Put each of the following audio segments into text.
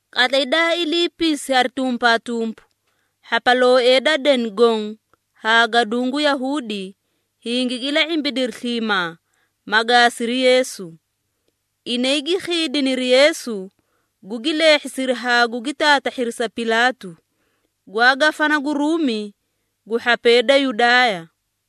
Qatlay daa iliipisi hari tumpaatumpu, hhapalooee da deni goõ haa gaduũ gu Yahuudi, hingigi ila⁄imbidiri sliimaa, ma gaasiri Yeesu. Inay gi khiidiniri Yeesu, gugi leehhisiri haa gugi taatahhiri sa Pilaatu, gwaa gafana gu Ruumi gu hhapee da Yudaaya.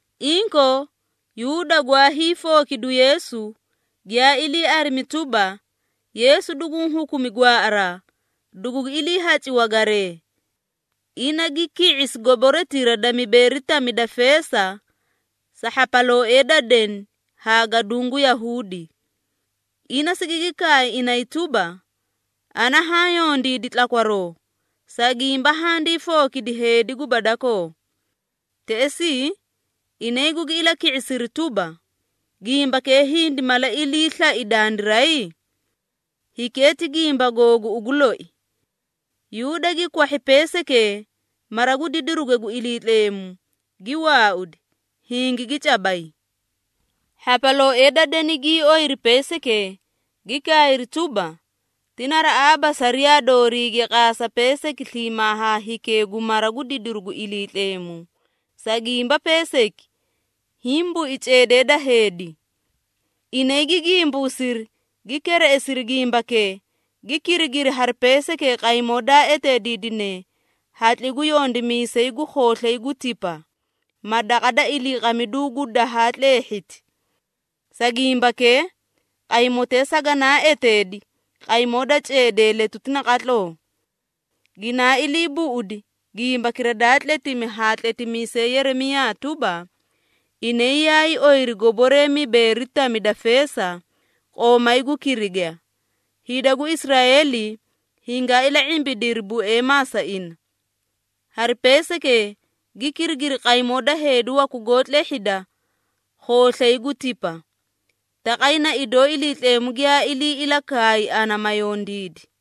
Inkoo, Yuuda gwaa hiifookidu Yeesu, giyaa ilii arimi tuba, Yeesu duguũ hukumi gwaaꞌaraa, dugugi iliihaci wagaree. Ina gi ki⁄isi goboretira da mibeeri tami da feesa, sa hhapalooee da deni haa gaduũ gu Yahuudi. Ina sigigi kaay inay tuba, “Ana haã yondiidi tlakwaroo, sa gimba handii fookidi heedi guba dakoo.” Teꞌesii, inay gugi ilaki⁄isiri tuba, “Gimbakee hindi mala ilii slai dandiray? Hikee ti gimba googu ugu loi.” Yuuda gi kwahhi peesaykee mara gu didiruge gu Iliitleemu, gi waaudi, hingigi cabay. Hhapalooee da deni gii oyiri peesaykee, gi kaayri tuba, “Ti naraꞌaaba sariyaa dooriige qaasa peesayki sliimaa haa hikee gu mara gu didiru gu Iliitleemu, sa gimba peesayki hiĩ bui ceedee da heedi.” Inay gi gimbuusiri, gi kereꞌesiri gimbakee, gi kirigiri hari peesaykee qaymoo daa eteediidine hatli gu yondimiisay gu khooslay gu tipa, ma daqa da iliiqamiduu gu dahaa tleehhiti. Sa gimbakee, qaymotee saganaa eteedi, qaymoo da ceedee letuti naqatloo. Ginaa ilii buꞌudi gimbakira daa tletimi ha tletimiisay Yeremiyaa tuba, “Inay yaay oyiri goboree mibeeri tami da feesa, qoomay gu kiriga, hida gu Israeeli hingaa ila⁄imbidiri bueemaa sa ina. Hari peesaykee, gi kirigiri qaymoo da heedi waku goó tlehhida khooslay gu tipa. Taqay na idoo Iliitleemu giyaa ilii ilakaay ana ma yondiidi.”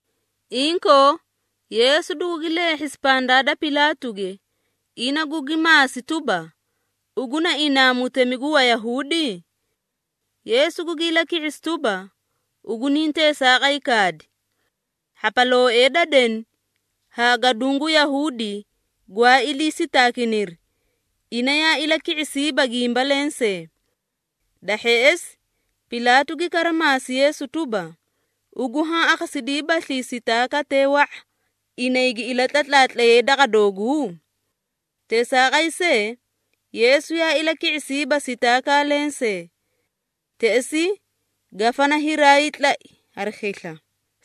Inkoo, Yeesu dugugi leehhesi pandaa da Pilaatuge, ina gugi maasi tuba, “Ugu na inaa mutemi gu Wayahuudi?” Yeesu gugi ilaki⁄isi tuba, “Ugu niĩ teesaaqay kaadi!” Hhapalooee da deni haa gaduũ gu Yahuudi gwaa ilii sitaakiniri, ina yaa ilaki⁄isiiba gimba lensee. Da hheꞌesi, Pilaatu gi kara maasi Yeesu tuba, “Ugu haã akhasidiibaslii sitaakatee wa⁄a, inay gi ilatlatlaatlayee daqa dooguu?” Teesaaqay see, Yeesu yaa ilaki⁄isiiba sitaakaa lensee. Teꞌesii, gafana hiraay tlai hari khisla,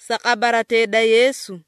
sa qabaratee da Yeesu.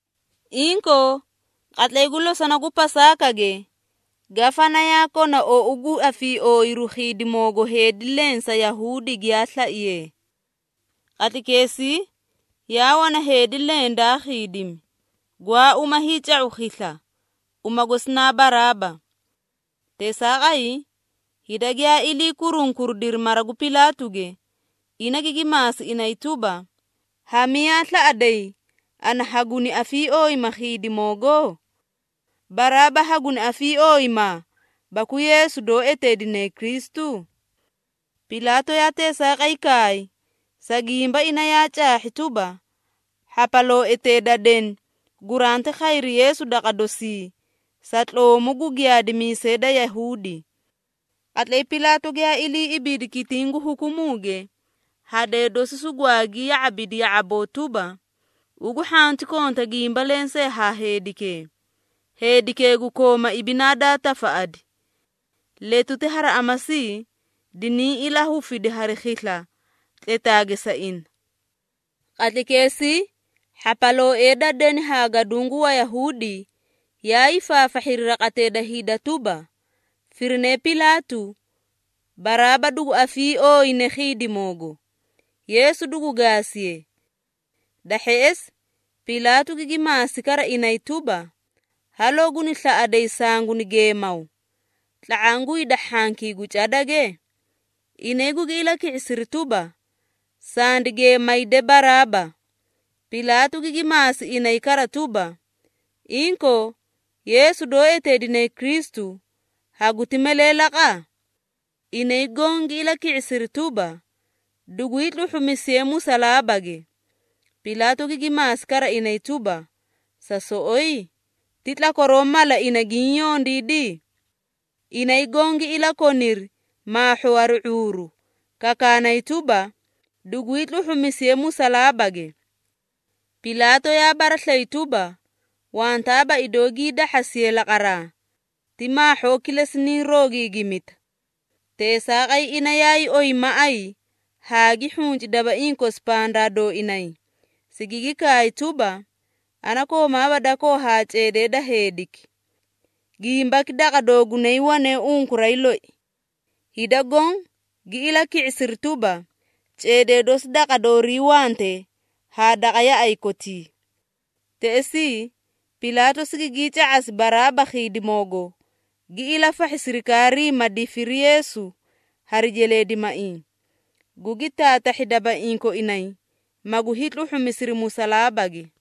Inkoo, qatlay gu losona gu Pasaakage, gafana yaa kona ou gu afiiooyiru khiidimoogo heedi leẽ sa Yahuudi giyaa slaiyee. Qatlaykeesii, yaa wana heedi leẽ daa khiidimi, gwaa uma hiica⁄u khisla, uma gosi na Baraaba. Teesaaqay, hida giyaa ilii kurunkuridiri mara gu Pilaatuge, ina gigi maasi inay tuba, “Ha miyaa slaꞌaday, ana haguni afiiooyima khiidimoogo? Baraaba haguni afiiooyimaa baku Yeesu doó eteedine Kristu?” Pilaatu yaa teesaaqay kaay, sa gimba ina yaa caahhi tuba, hhapalooetee da deni guranti khayri Yeesu daqa dosii, sa tloomu gu giyaadimiisee da Yahuudi. Qatlay Pilaatu giyaa ilii ibiidi kitiĩ gu hukumuuge, hadee dosi sugwaagi ya⁄abidi ya⁄aboo tuba, “Ugu hhanti konta gimba lensee haa heedikee, heedikee gu kooma ibinaa daa tafaꞌadi. Letuti hari amasi diniĩ ilahufidi hari khisla tletaage sa ina.” Qatlaykeesii, hhapalooee da deni haa gaduũ gu Wayahuudi yaa hiifaafahhiri raqatee da hida tuba, firinee Pilaatu, Baraaba dugu afiiooyine khiidimoogo, Yeesu dugu gaasiye. Da hheꞌesi, Pilaatu gigi maasi kara inay tuba, “Haloo guni slaꞌaday sanguni geemaw, tla⁄aã gu hida hhankii gu cadage?” Inay gugi ilaki⁄isiri tuba, “Sandi geemayde Baraaba.” Pilaatu gigi maasi inay kara tuba, “Inkoo, Yeesu doó eteedine Kristu, haguti malee laqa?” Inay goõ gi ilaki⁄isiri tuba, “Dugwii tluhhumisiye musalaabage!” Pilaatu gigi maasi kara inay tuba, “Sa soꞌoyi? Ti tlakwaroo mala ina giĩ yondiidi?” Inay goõ gi ilakoniri maahhoo hari ⁄uuru, kakaanay tuba, “Dugwii tluhhumisiye musalaabage!” Pilaatu yaa baraslayi tuba, wantaaba idoo gii dahhasiye laqaraa, ti maahhoo kilesi nii roogiigimita. Teesaaqay ina yaay oyi maꞌay haa gi hhunci dabaiĩ kosi pandaa dooinay, sigigi kaay tuba, “Ana koomaaba dakoo haa ceedee da heediki. Gimbaki daqa doogunay wane unkuray loi.” Hida goõ gi ilaki⁄isiri tuba, “Ceedee dosi daqa doorii wante haa daqa yaꞌay kotii!” Teꞌesii, Pilaatu sigigii ca⁄asi Baraaba khiidimoogo, gi ilafahhi sirikaarii ma difiri Yeesu hari jeleedimaiĩ, gugi taatahhi dabaiĩ koinay, magu hiitluhhumisiri musalaabage.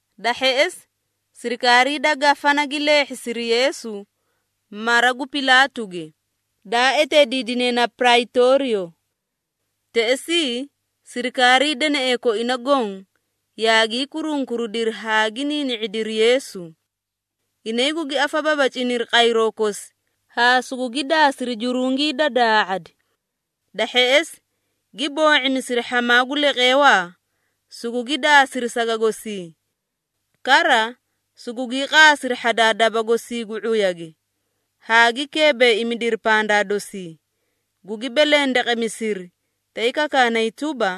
Da hheꞌesi, sirikaarii da gafana gi leehhisiri Yeesu, mara gu Pilaatuge, daa eteediidine na Praytooriyo. Teꞌesii sirikaarii deneꞌee koina goõ yaagii kurunkuridiri haa gi niini⁄idiri Yeesu. Inay gugi afababaciniri qayroo kosi haa sugugi daasiri jurungii da daa⁄adi. Da hheꞌesi, gi boo⁄imisiri hhamaa gu leqeewaa, sugugi daasiri saga gosii. Kara, sugugii qaasiri hhadaa daba gosii gu ⁄uyage, haa gi keebeeimidiri pandaa dosii, gugi belendeqemisiri tay kakaanay tuba,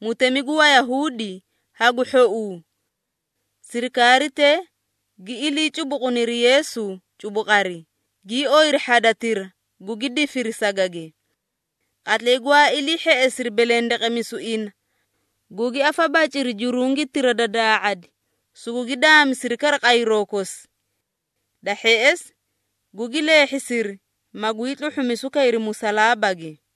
“Mutemi gu Wayahuudi hagu hhouu!” Sirikaaritee gi ilii cubuquniri Yeesu cubuqari, gii oyiri hhadatira gugi difiri sagage. Qatlay gwaa ilii hheꞌesiri belendeqemisu ina, gugi afabaciri jurungitira da daa⁄adi, sugugi daamisiri kara qayroo kosi. Da hheꞌesi gugi leehhisiri, magwii tluhhumisu kayri musalaabage.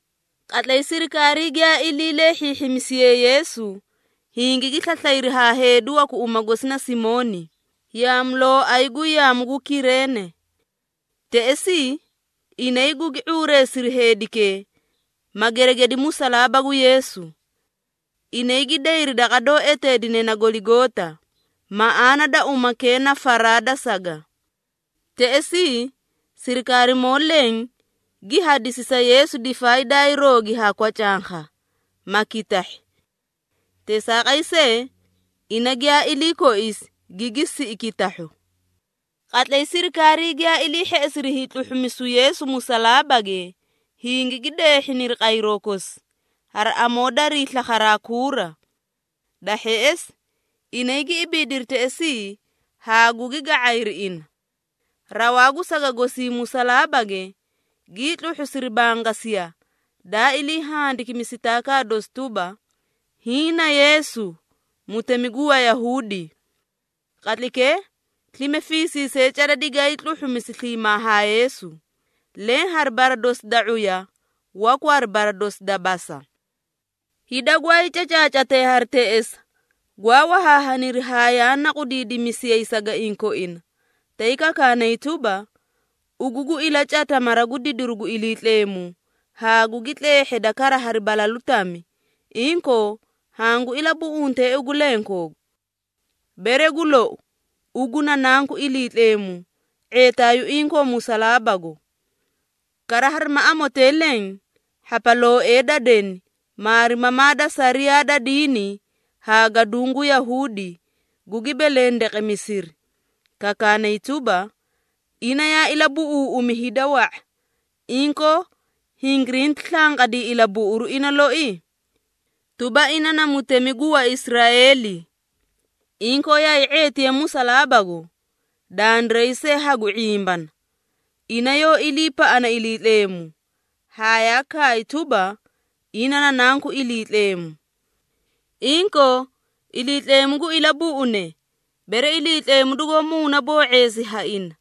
Qatlay sirikaarii giyaa ilii leehhiihhimisiyee Yeesu, hingigi slaslayri haa heedi waku uma gosi na Simooni, yaamulooay gu yaamu gu Kireene. Teꞌesii inay gugi ⁄uureesiri heedikee, ma geregedi musalaaba gu Yeesu. Inay gi dayri daqa doó eteedine na Goligoota, maꞌaana da umakee na, “Faraa da Saga.” Teꞌesii, sirikaarimoo leẽ gi hadisi sa Yeesu difaay daay roogi haa kwacankha, ma kitahhi. Teesaaqay see, ina giyaa ilii koisi, gigi siꞌi kitahhu. Qatlay sirikaarii giyaa ilii hheꞌesiri hiitluhhumisu Yeesu musalaabage, hingigi deehhiniri qayroo kosi, hari amoo darii slakharaa kuura. Da hheꞌesi, inay gi ibiidiri teꞌesii haa gugi ga⁄ayri ina. Rawaa gu saga gosii musalaabage, gii tluhhusiri bangasiya, daa ilii handikimi sitaakaa dosi tuba, “HIĨ NA YEESU, MUTEMI GU WAYAHUUDI.” Qatlaykee, slime fiisiisee cada digaay tluhhumisi sliimaa haa Yeesu, leẽ hari bara dosi da ⁄uya, waku hari bara dosi da basa. Hida gwaay cacaacatee hari teꞌesa, gwaa wahaahaniri haa yaa naqudidimisiyay sagaiĩ koina, tay kakaanay tuba, “Ugu gu ilacata mara gu didiru gu Iliitleemu, haa gugi tleehheda kara hari balalu tami, inkoo, hangu ilabuꞌunte ugu lenkoogu! Bere gu lou, ugu na Nanku Iliitleemu ⁄eetaayuu inkoo musalaabago.” Kara harima amotee leẽ, hhapalooee da deni, maarimamaa da sariyaa da diini haa gaduũ gu Yahuudi, gugi belendeqemisiri, kakaanay tuba, “Ina yaa ilabuꞌuuꞌumi hida wa⁄a, inkoo hingirinti slanqadii ilabuꞌuru ina loi? Tuba ina na mutemi gu Waisraeeli! Inkoo yaay ⁄eetiye musalaabago, dandiray see hagu ⁄imbana. Ina yoó iliipaꞌana Iliitleemu, haa yaa kaay tuba, ‘Ina na Nanku Iliitleemu.’ Inkoo Iliitleemu gu ilabuꞌune, bere Iliitleemu dugoó muunaboo⁄eesi ha ina.”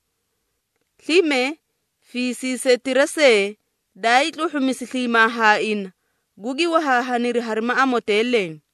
Slime, fiisiisetira see daay tluhhumisi sliimaa haa ina, gugi wahaahaniri harima amotee leẽ.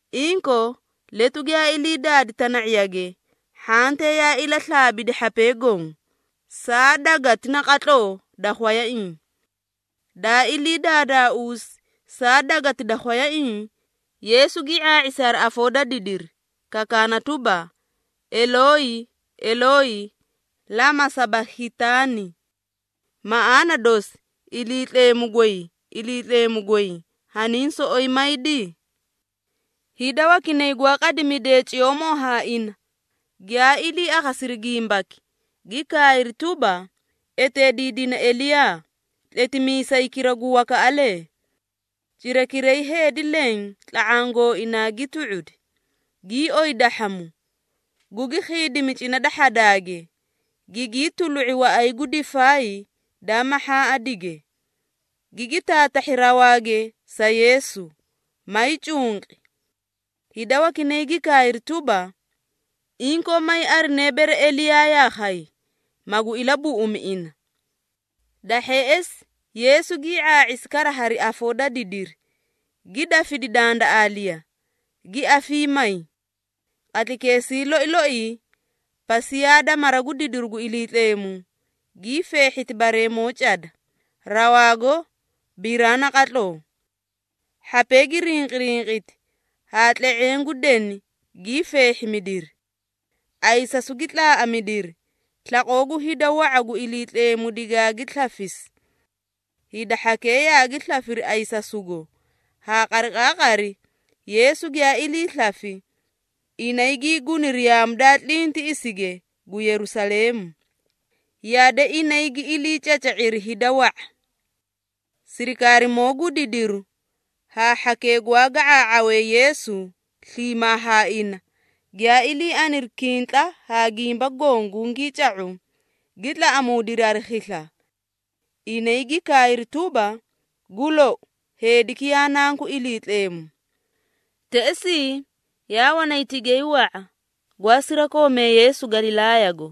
Inkoo, letu giyaa ilii daadi tana⁄iyage, hhantee yaa ilaslaabidi hhapee goõ, saa gweleti naqatloo da khwayaiĩ. Daa ilii daadaauusi saa gweleti da khwayaiĩ, Yeesu gii ⁄aa⁄isi hari afoo da didiri, kakaana tuba, “Elooyi, Elooyi, lama sabakhitaani?” Maꞌaana dosi, “Iliitleemu goy, Iliitleemu goy, haniĩ soꞌoyi maydi?” Hida wakinay gwaa qadimidee ciyoomoo haa ina, giyaa ilii akhasiri gimbaki, gi kaayri tuba, “Eteediidina Eliyaa, tletimiisaykira gu wakaꞌalee.” Cirakiray heedi leẽ tla⁄aã gooinaa gi tu⁄udi, gii oyi dahhamu, gugi khiidimi cina da hhadaage, gigii tulu⁄i waꞌay gu difaay da mahhaaꞌadige, gigi taatahhi rawaage sa Yeesu, maay cunqi. Hida wakinay gi kaayri tuba, “Inkoo may arine bere Eliyaa yaa khay, magu ilabuꞌumi ina.” Da hheꞌesi, Yeesu gii ⁄aa⁄isi kara hari afoo da didiri, gi dafidi dandaꞌaaliya, gi afiimayi. Qatlaykeesii loi loii, pasiyaa da mara gu didiru gu Iliitleemu, gii feehhiti bareemoo cada, rawaago biraa naqatloo. Hhapee gi rinqirinqiti, haa tle⁄eẽ gu deni gii feehhimidiri. Ayisasu gi tlaaꞌamidiri, slaqoo gu hida wa⁄a gu Iliitleemu digaagi slafisi. Hida hhakee yaagi slafiri ayisasugo, haa qariqaaqari Yeesu giyaa ilii slafi, inay gii guniri yaamu daa tlintiꞌisige gu Yerusaleemu. Yade inay gi iliicaca⁄iri hida wa⁄a. Sirikaarimoo gu didiru haa hhakee gwaa ga⁄aa⁄awee Yeesu sliimaa haa ina, giyaa ilii aniri kintla haa gimba goõ gungii ca⁄u, gi tlaꞌamuudiri hari khisla. Inay gi kaayri tuba, “Gu lou, heediki yaa Nanku Iliitleemu.” Teꞌesii, yaa wanay tigay wa⁄a, gwaa sirakoomee Yeesu Galilaayago,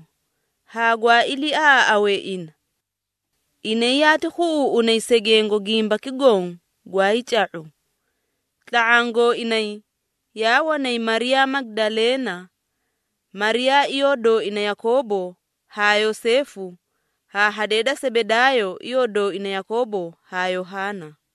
haa gwaa iliiaꞌaaꞌawee ina. Inay yaati khuꞌuuꞌunay segengo gimbaki goõ gwaay ca⁄u. Tla⁄aã gooinay yaa wanay Mariyaa Magidaleena Mariyaa iyoo dooina Yakoobo haa Yoseefu, haa hadee da Sebedaayo iyoo dooina Yakoobo haa Yohaana.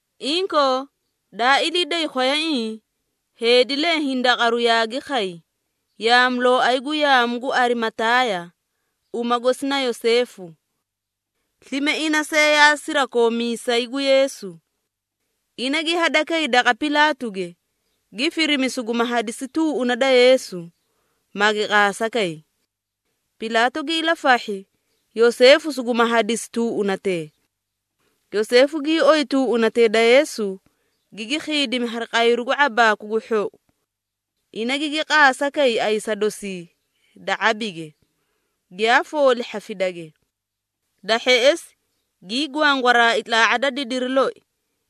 Inkoo, daa ilii day khwayaiĩ, heedi leẽ hindaqaru yaagi khay, yaamulooay gu yaamu gu Arimataaya, uma gosi na Yoseefu. Slime ina see yaa sirakoomiisay gu Yeesu. Ina gi hadakay daqa Pilaatuge, gi firimi suguma hadisi tuuꞌuna da Yeesu, magi qaasa kay. Pilaatu gi ilafahhi, Yoseefu suguma hadisi tuuꞌunatee. Yoseefu gii oyi tuuꞌunatee da Yeesu, gigi khiidimi hari qayru gu ⁄abaaku gu hhou. Ina gigi qaasa kay ayisa dosii da ⁄abige, giyaa fooli hhafidage. Da hheꞌesi, gii gwangwaraai tlaa⁄a da didiri loi,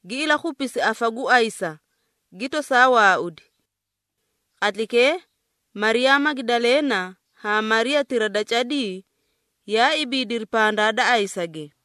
gi ilakhupisi afa gu ayisa, gi tosaa waaudi. Qatlaykee, Mariyaa Magidaleena haa Mariyaatira da cadii, yaa ibiidiri pandaa da ayisage.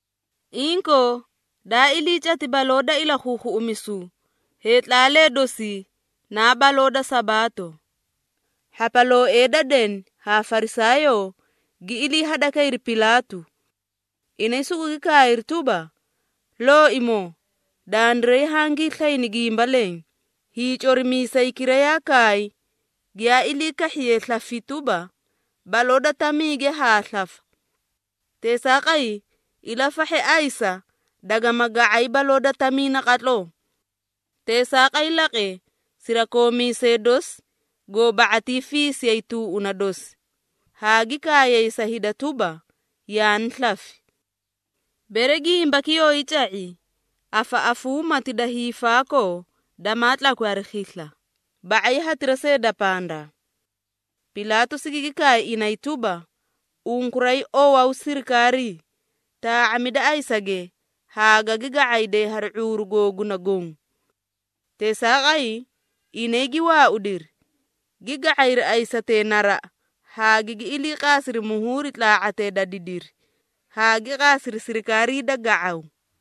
Inkoo, daa ilii cati baloo da Ilakhuukhuꞌumisu, heetlaalee dosii naa baloo da Sabaato. Hhapalooee da deni haa Farisaayoo, gi ilii hadakayri Pilaatu. Inay sugugi kaayri tuba, “Looimoo, dandiray hangii slayni gimba leẽ, hiicorimiisaykira yaa kaay, giyaa ilii kahhiye slafi tuba, ‘Baloo da tamiige haa slafa.’ Teesaaqay, ilafahhe ayisa dagama ga⁄ay baloo da tamii naqatloo. Teesaaqay laqe, sirakoomiisee dosi goo ba⁄atii fiisiyay tuuꞌuna dosi, haa gi kaayay sa hida tuba, yaani slafi. Bere gimbaki yooyi ca⁄i, afaꞌafuumati da hiifaakoo damaa tlakwi hari khisla, ba⁄ay hatira see da pandaa.” Pilaatu sigigi kaay inay tuba, “Unkuray owaw sirikaarii. Taa⁄amida ayisage haa gagi ga⁄ayday hari ⁄uuru googuna goõ.” Teesaaqay, inay gi waaudiri, gi ga⁄ayri ayisatee naraꞌa haa gigi iliiqaasiri muhuuri tlaa⁄atee da didiri, haa gi qaasiri sirikaarii da ga⁄aw.